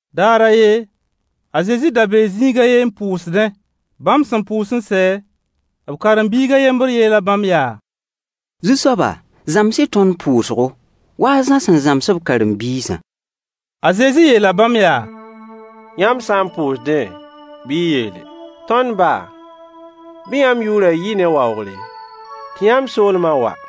Daar a yen, a Zezi da bee zĩig a ye n pʋʋsdẽ. Bãmb sẽn pʋʋs n sɛ, b karen-biig a yembr yeela bãmb yaa: Zu-soaba, zãms-y tõnd pʋʋsgo, wa a Zã sẽn zãms b karen-biisã. A Zezi yeela bãmb yaa: Yãmb sã n pʋʋsdẽ, bɩ y yeele: Tõnd ba! Bɩ yãmb yʋʋrã yɩ ne waoogre, tɩ yãmb soolmã wa.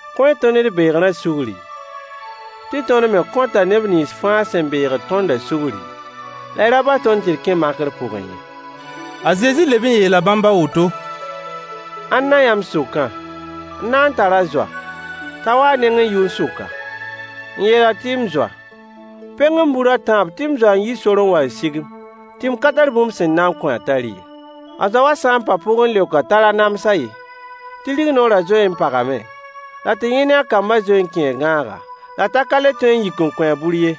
Kõ-y tõnd d beegrã sugri, tɩ tõnd me kõta neb nins fãa sẽn beegd tõndã sugri, la y ra bas tõnd tɩ d kẽ makr pʋgẽ ye. A Zezi leb n yeela bãmb a woto: Ãnna yãmb sʋkã n na n tar a zoa, t'a wa a nengẽ yʋn-sʋka, n yeel-a tɩ “m zoa, peng-m bur a tãab tɩ m zoa n yi sor n wa n sig-m tɩ m ka tar bũmb sẽn na kõ-a t'a rɩ ye”. A zoa wã sã n pa pʋgẽ n leok-a t'a ra nams-a ye, tɩ rignoorã zoe n pagame, la tɩ yẽ ne a kambã zoee n kẽe gãaga, la t'a ka le tõe n yik n kõ-a bur ye.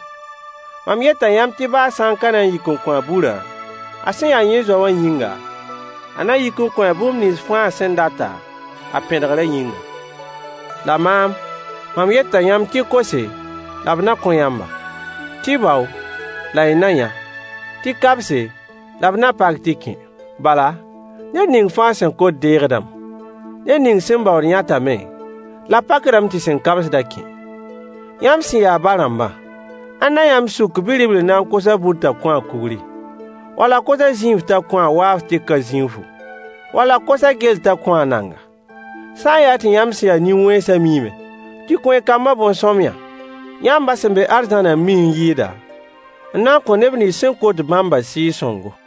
Mam yeta yãmb tɩ baa a sã n ka na n yik n kõ-a burã, a sẽn ya yẽ zoa wã yĩnga, a na yik n kõ-a bũmb nins fãa a sẽn data, a pẽdgrã yĩnga. La maam, mam yeta yãmb tɩ y kose la b na kõ yãmba, tɩ y bao la y na yã, tɩ y kabse la b na pak tɩ y kẽ. Bala, ned ning fãa sẽn kot deegdame. Ned ning sẽn baood yãtame, la b pakdame tɩ sẽn kabsd-a kẽ. Yãmb sẽn ya ba-rãmbã, ãnna yãmb sʋk bi-ribl n na n kos-a bur t'a kõ-a kugri, wall a kos-a zĩinf t'a kõ-a waaf tɩ ka zĩinfu, wall a kos-a gell t'a kõ-a nanga? Sã n yaa tɩ yãmb sẽn ya nin-wẽnsã miime tɩ kõ y kambã bõn-sõamyã, yãmb ba sẽn be arzãnã n mi n yɩɩda, n na n kõ neb nins sẽn kot bãmbã Sɩɩg-sõngo.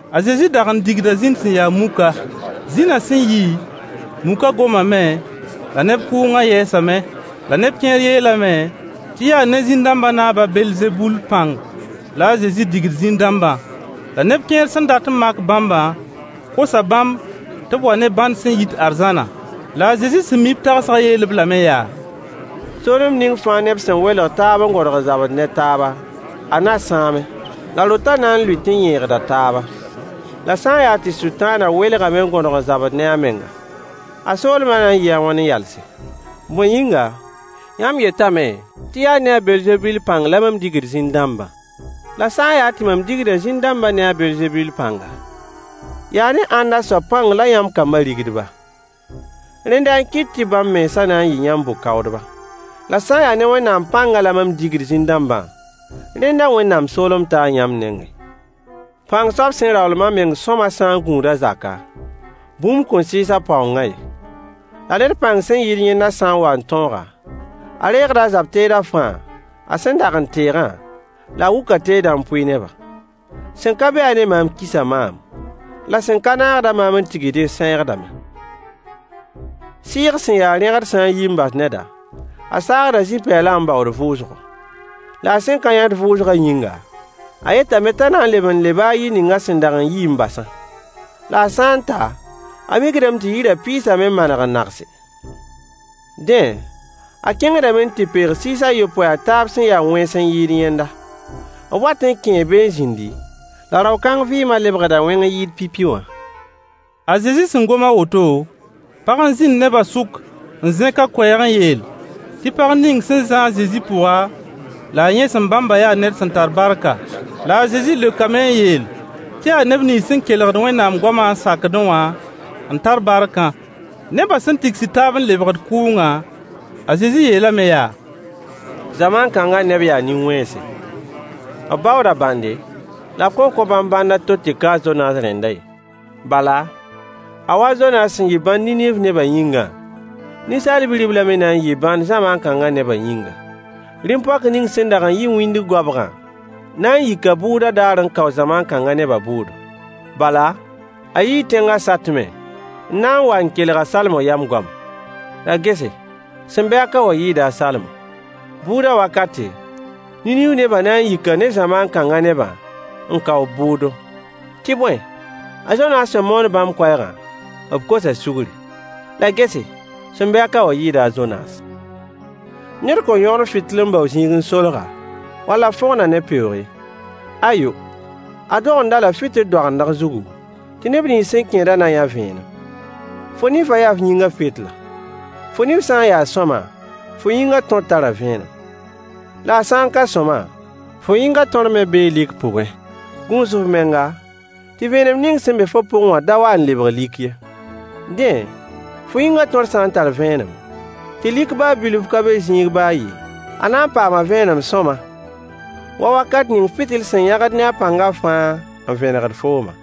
A Zezi dag n digda zĩn sẽn ya muka. Zĩnã sẽn yi, mukã gomame, la neb kʋʋngã yɛɛsame. La neb kẽer yeelame tɩ yaa ne zĩn-dãmbã naab a Belzebul pãng la a Zezi digd zĩn-dãmbã. La neb kẽer sẽn dat n mak bãmbã kosa bãmb tɩ b wa ne bãnd sẽn yit arzãna. La a Zezi sẽn mi b tagsgã yeel-b lame yaa: soolem ning fãa neb sẽn welg taab n gõdg n zabd ne taaba, a na sãame, la rotã na n lʋɩt n yẽegda taaba. La sã n yaa tɩ Sʋtãanã welgame n gõdg n zabd ne a menga, a soolmã na n yɩɩ a wãn n yalse? Bõe yĩnga, yãmb yetame tɩ yaa ne a Belzebul pãng la mam digd zĩn-dãmbã. La sã n yaa tɩ mam digda zĩn-dãmbã ne a Belzebul pãnga, yaa ne ãnna soab pãng la yãmb kambã rigd-ba? Rẽnda n kɩt tɩ bãmb mensã na n yɩ yãmb bʋ-kaoodba. La sã n yaa ne Wẽnnaam pãngã la mam digd zĩn-dãmbã, rẽnda Wẽnnaam soolem taa yãmb nengẽ. Pãng soab sẽn raoolem a meng sõama sã n gũud a zaka, bũmb kõn sɩɩs a paoongã ye. La ned pãng sẽn yɩɩd yẽnda sã n wa n tõog-a, a reegda a zab-teedã fãa a sẽn dag n teegã, la a wʋk a teedã n pʋɩ neba. Sẽn ka be-a ne maam kisa maam, la sẽn ka naagd-a maam n tigsdẽ sãeegdame. Sɩɩg sẽn ya rẽgd sã n yi n bas neda, a saagda zĩ-pɛɛlã n baood vʋʋsgo. La a sẽn ka yãt vʋʋsgã yĩnga, a yetame t'a na n leb n leba a yir ning a sẽn dag n yi n basã. La a sã n ta, a mikdame tɩ yirã pɩɩsame n maneg n nagse. Dẽ, a kẽngdame n tɩ peeg sɩɩs a yopoe a taab sẽn ya wẽns n yɩɩd yẽnda. B wat n kẽe be n zĩndi, la rao-kãng vɩɩmã lebgda wẽng n yɩɩd pipi wã. A Zezi sẽn gom a woto, pag n zĩnd nebã sʋk n zẽk a koɛɛg n yeel tɩ pag ning sẽn zã-a a Zezi pʋga la a yẽsem bãmbã yaa ned sẽn tar barka. La a Zezi leokame n yeel tɩ yaa neb nins sẽn kelgd Wẽnnaam goamã n sakdẽ wã n tar barkã. Nebã sẽn tigsd taab n lebgd kʋʋngã, a Zezi yeelame yaa: Zamaan kãngã neb yaa nin-wẽnse. B baooda bãnde, la b kõn kõ bãmb bãnd a to tɩ ka a Zonaas rẽndã ye. Bala, a wa a Zonaas sẽn yɩ bãnd Niniiv nebã yĩngã, Ninsaal Bi-riblã me na n yɩɩ bãnd zamaan kãngã nebã yĩnga. Rĩm-poak ning sẽn dag n yi wĩndg goabgã na n yika bʋʋdã daar n kao zamaan kãngã nebã bʋʋdo. Bala, a yii tẽngã satmẽ n na n wa n kelg a Salomo yam goama. La gese, sẽn be-a ka wã yɩɩda a Salomo. Bʋʋdã wakate, Niniiv nebã na n yika ne zamaan kãngã nebã n kao b bʋʋdo. Tɩ bõe, a Zonaas sẽn moon bãmb koɛɛgã, b kosa sugri. La gese, sẽn be-a ka wã yɩɩda a Zonaas. Ned kõn yõgen fɩtɩl n bao zĩig n solg-a, wall a fõgen-a ne peoog ye. Ayo! A dogend-a-la fɩtɩl doagendg zugu, tɩ neb nins sẽn kẽedã na yã vẽenem. Fo nifã yaa f yĩngã fɩtla. Fo nif sã n ya sõama, fo yĩngã tõr tara vẽenem. La a sã n ka sõama, fo yĩngã tõr me bee lik pʋgẽ. Gũus f menga, tɩ vẽenem ning sẽn be fo pʋgẽ wã da wa n lebg lik ye. Dẽ, fo yĩngã tõr sã n tar vẽenem, tɩ lik baa bilf ka be zĩig baa a ye, a na n paama vẽenem sõama wa wakat ning fɩtɩl sẽn yãgd ne a pãngã fãa n vẽnegd foomã.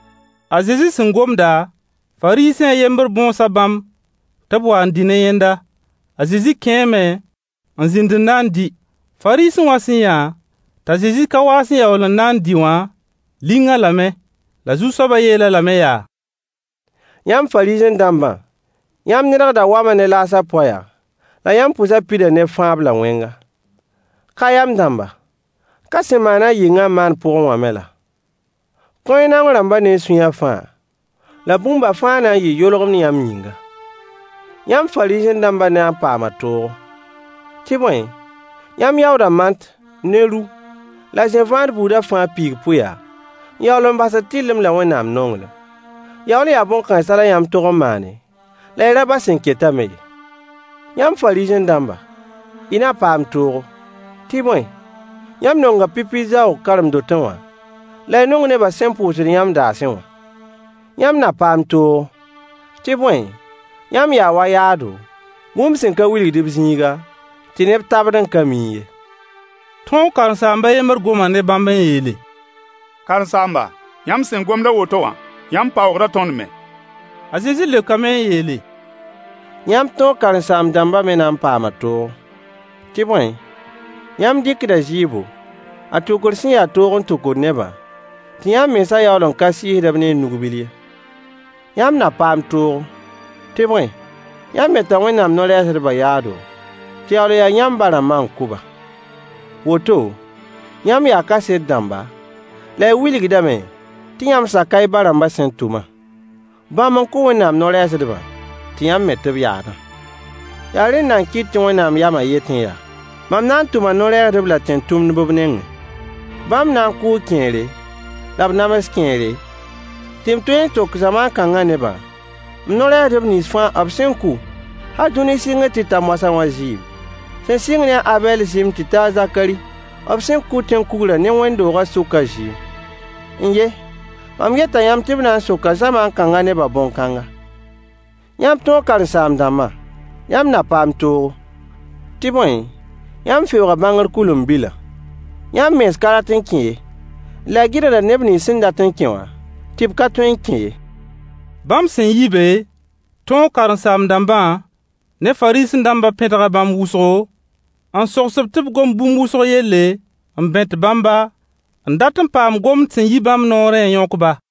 A Zezi sẽn gomda, Fariisẽ a yembr bõosa bãmb tɩ b wa n dɩ ne yẽnda. A Zezi kẽeme n zĩnd n na n dɩ. Fariisẽ wã sẽn yã t'a Zezi ka waas n yaool n na n dɩ wã, ling-a lame. La Zu-soabã yeel-a lame yaa: Yãmb Fariisẽ-dãmbã, yãmb nedgda wama ne laasã poaya, la yãmb pʋsã pida ne fãab la wẽnga. Ka-yam-dãmba, ka sẽn maan-a yɩngã n maan pʋgẽ wã me laa? Kõ-y naong rãmbã ne y sũyã fãa, la bũmba fãa na n yɩɩ yolgemd yãmb yĩnga. Yãmb Fariisẽ-dãmbã na n paama toogo! Tɩ bõe, yãmb yaooda mant Mant, Ru Yaa zẽ-vãad buudu. ne ru la zẽ-vãad buudã fãa piig-pʋɩya, n yaool n basd tɩrlem la Wẽnnaam nonglem. Yaool n yaa bõn-kãensã la yãmb tog n maane, la y ra bas sẽn ketã me ye. Yãmb Fariisẽ-dãmbã, y na paam toogo! Tɩ bõe, yãmb nonga pipi zaoog karen-dotẽ wã, la y nong nebã sẽn pʋʋsd yãmb daasẽ wã. Yãmb na paam toogo! Tɩ bõe, yãmb yaa wa yaado, bũmb sẽn ka wilgd b zĩiga, tɩ neb tabd n ka miẽ ye. Tõog karen-saamb a yembr goma ne bãmb n yeele: Karen-saamba, yãmb sẽn gomd a woto wã, yãmb paoogda tõnd me. A Zezi leokame n yeele: Yãmb tõog karen-saam-dãmbã me na n paama toogo! Tɩ bõe, yãmb dɩkda zɩɩbo, a tʋkr sẽn ya toog n tʋkd nebã, tɩ yãmb mensã yaool n ka sɩɩsd-b ne y nug-bil ye. Yãmb na paam toogo! Tɩ bõe, yãmb meta Wẽnnaam no-rɛɛsdbã yaado, tɩ yaool n ya yãmb ba-rãmbã n kʋ-ba. Woto, yãmb yaa kaset rãmba, la y wilgdame tɩ yãmb saka y ba-rãmbã sẽn tʋmã. Bãmb n kʋ Wẽnnaam no-rɛɛsdbã, tɩ yãmb met b yaadã. Yaa rẽnda n kɩt tɩ Wẽnnaam yamã yetẽ yaa: Mam na n tʋma no-rɛɛsdb la tẽn-tʋmdb b nengẽ. Bãmb na n kʋʋ kẽere, la b nams kẽere, tɩ m tõe n sok zamaan kãngã nebã m no-rɛɛsdb nins fãa b sẽn kʋ hal dũni sɩngr tɩ ta moasã wã zɩɩm, sẽn sɩng ne a Abɛl zɩɩm tɩ ta a Zakari b sẽn kʋ tẽn-kugrã ne wẽnd-doogã sʋkã zɩɩm. N-ye! Mam yeta yãmb tɩ b na n soka zamaan kãngã nebã bõn-kãnga. Yãmb tõog karen-saam-dãmbã, yãmb na paam toogo! Tɩ bõe, yãmb feooga bãngr kʋɩlen-bilã. Yãmb mens ka rat n kẽ ye, la y gɩdgda neb nins sẽn dat n kẽ wã tɩ b ka tõe n kẽ ye. Bãmb sẽn yi be, tõog karen-saam-dãmbã ne Fariisẽ-dãmbã pẽdga bãmb wʋsgo, n sogs-b tɩ b gom bũmb wʋsg yelle, n bẽt bãmba n dat n paam gomd sẽn yi bãmb noorẽ n yõk-ba.